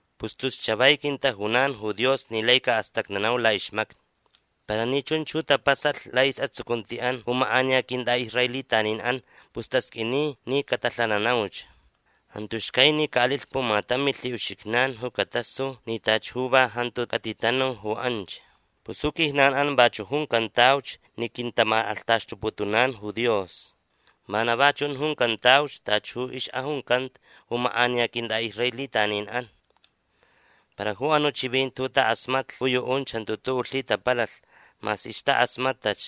Pus tus chavai quintajunan ju Dios ni lai caʼastacnanau laʼixmacni. Para ni chunch ju tapasalh laʼisʼatsucuntiʼan ju makʼaniya quintʼaʼisraelitaninʼan pus tasqʼuini ni catalhananauch. Jantu xcai ni caʼalilh pumatam milhiʼuxijnan ju catasu ni tachi ju va jantu catitanu ju anch. Pus ju quijnanʼan vachuʼ juncantauch ni quintamakʼalhtaxtuputunan ju Dios. Vana va chunch juncantauch tachi ju ixʼajuncanta ju makʼaniya quintʼaʼisraelitaninʼan. Para ju anuʼ chivinti ju takʼasmatlh ju yuʼunch jantu tuʼuʼ lhitapalalh mas ixtakʼasmatʼach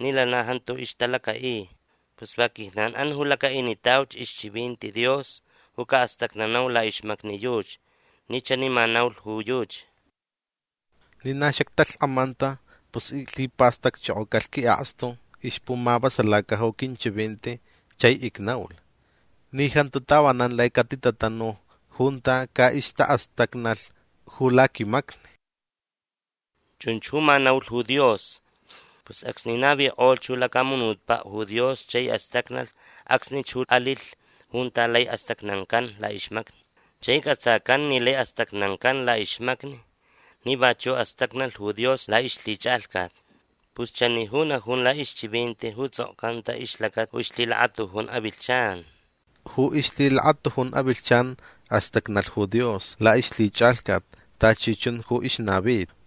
ni lana jantu ixtalacaʼi. Pus va quijnanʼan ju lacaʼinitauch ixchivinti Dios ju caʼastacnanau laʼixmacni yuchi ni chani ma naulh ju yuchi: Ni na xactalhkʼamanta pus iclhipastacchokocalh quiʼakstu ixpumavasalaca ju quinchivinti chai icnaulh ni jantu tavanan lai catitatanu junta caʼixtaʼastacnalh ju laquimacni. Chunch ju ma naulh ju Dios. Pus acsni navikʼolh ju lacamunutpaʼ ju Dios chai astacnalh acsnich ju alilh junta lai astacnancan laʼixmacni. Chai cʼatsacan ni lai astacnancan laʼixmacni ni vachuʼ astacnalh ju Dios laʼixlhichʼalhcat. Pus chani ju najun laʼixchivinti ju tsʼokcanta ixlacata ju ixlhilakatujun avilhchan: Ju ixlhilakatujun avilhchan astacnalh ju Dios laʼixlhichʼalhcat tachi chun ju ixnavita.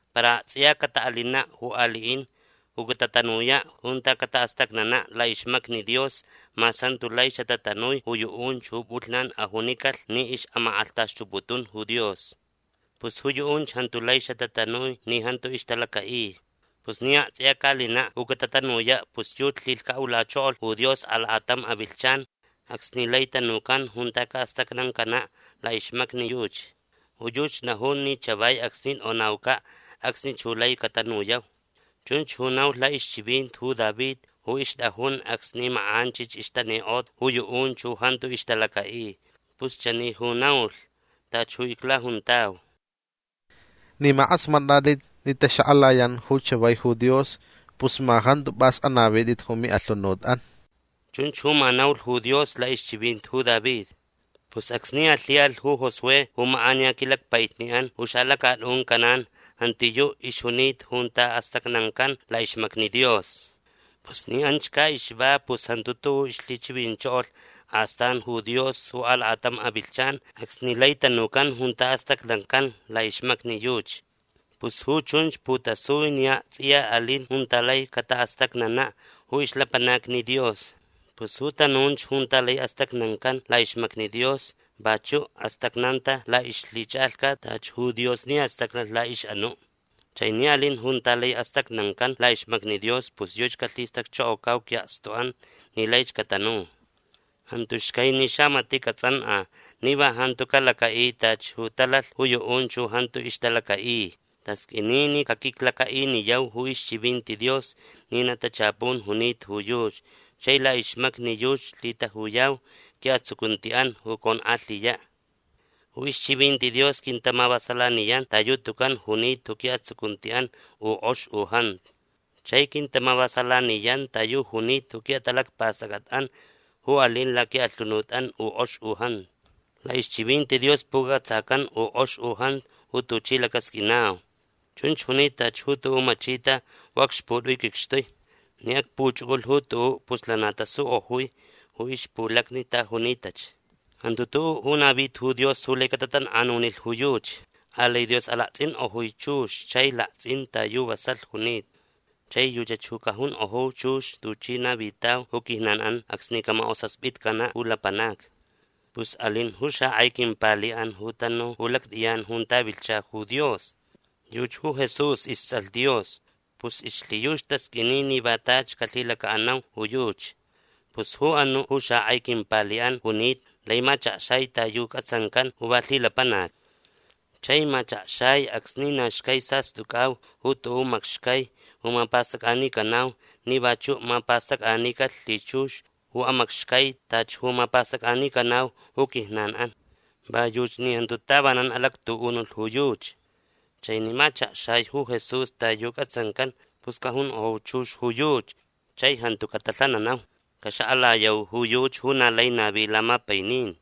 Para aktsʼiya cataʼalinaʼ ju aliʼin ju catatanuyaʼ junta cataʼastacnanaʼ laʼixmacni Dios mas jantu lai xatatanui ju yuʼunch ju pʼulhnan ajunicalh ni ixʼamakʼalhtaxtuputun ju Dios. Pus ju yuʼunch jantu lai xatatanui ni jantu ixtalacaʼi. Pus ni aktsʼiya caʼalinaʼ ju catatanuyaʼ pus yuchi lhilhcaʼulachokolh ju Dios alakatam avilhchan acsni lai tanucan junta caʼastacnancanaʼ laʼixmacni yuchi. Ju yuchi najun ni chavai acsni tʼonaucaʼ acsnich ju lai catanuyau. Chunch ju naulh laʼixchivinti ju David ju ixtʼajun acsni makʼanchich ixtanikʼota ju yuʼunch ju jantu ixtalacaʼi. Pus chani ju naulh tachi ju iclajuntau: Ni ma kʼasmatʼatʼit ni taxakʼalayan ju chavai ju Dios pus ma jantu pʼas anavitʼit ju miʼalhunutʼan. Chunch ju ma naulh ju Dios laʼixchivinti ju David. Pus acsni alhiʼalh ju Josué ju makʼaniya quilacpaʼitniʼan ju xalacatʼun Canaán jantiyuʼ ixjunita junta astacnancan laʼixmacni Dios. Pus ni anchach caʼixva pus jantu tuʼuʼ ixlhichivinchokolh astan ju Dios ju alakatam avilhchan acsni lai tanucan junta astacnancan laʼixmacni yuchi. Pus ju chunch putasui ni aktsʼiya alin junta lai cataʼastacnanaʼ ju ixlapanacni Dios. Pus ju tanunch junta lai astacnancan laʼixmacni Dios vachuʼ astacnanta laʼixlhichʼalhcat tachi ju Dios ni astacnalh laʼixʼanuʼ. Chai ni alin junta lai astacnancan laʼixmacni Dios pus yuchi calhilhistacchokocau quiʼakstuʼan ni laich catanu. Jantu xcai ni xamatiʼ catsʼankʼa ni va jantu calacaʼi tachi ju talalh ju yuʼunch ju jantu ixtalacaʼi. Tasqʼuini ni caquiclacaʼiniyau ju ixchivinti Dios ni na tachapun junita ju yuchi chai laʼixmacni yuchi lhitajuyau quiʼatsucuntiʼan ju conkʼalhiyaʼ. Ju ixchivinti Dios quintamavasalaniyan ta yu tucan junita ju quiʼatsucuntiʼan u kʼox u jantu. Chai quintamavasalaniyan ta yu junita ju quiʼatalacpastʼacʼatʼan ju alin laquiʼalhunutʼan u kʼox u jantu. Laʼixchivinti Dios pucʼatsacan u kʼox u jantu ju tuchi lacasqʼuinau. Chunch junita tachi ju tuʼuʼ machita ju acxputʼui quicxtui. Ni acpuchʼucʼulh ju tuʼuʼ pus lana tasukʼojui ju ixpulacni ta junitach. Jantu tuʼuʼ ju navita ju Dios ju lai catatankʼanunilh ju yuchi. Alai Dios alaktsʼinkʼojui chux chai laktsʼin ta yu vasalh junita. Chai yuchach ju cajunkʼoju chux tuchi navitau ju quijnanʼan acsni camakʼosaspitcanaʼ ju lapanacni. Pus alin ju xakʼai quimpaliʼan ju tanu ju lactʼiyan junta vilhcha ju Dios. Yuchi ju Jesús istsʼalh Dios. Pus ixlhiyuchi tasqʼuini ni va tachi calhilacaʼanau ju yuchi. Pus ju anuʼ ju xakʼai quimpaliʼan junita lai machakxai ta yu cʼatsancan ju va lhilapanac. Chai machakxai acsni na xcai sastʼucʼau ju tuʼuʼ macxai ju mapastʼacʼanicanau ni vachuʼ mapastʼacʼanicalh lhichux ju amacxcai tachi ju mapastʼacʼanicanau ju quijnanʼan. Va yuchi ni jantu tavanan alactuʼunulh ju yuchi. Chai ni machakxai ju Jesús ta yu cʼatsancan pus cajunkʼoju chux ju yuchi chai jantu catalhananau. Caxakʼalayau ju yuchi ju na lai navi lamapainin.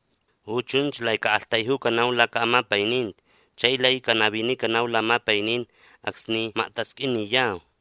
Ju chunch lai caʼaktaijucanau lacaʼamapaininti chai lai canavinicanau lamapainin acsni maktasqʼuiniyau.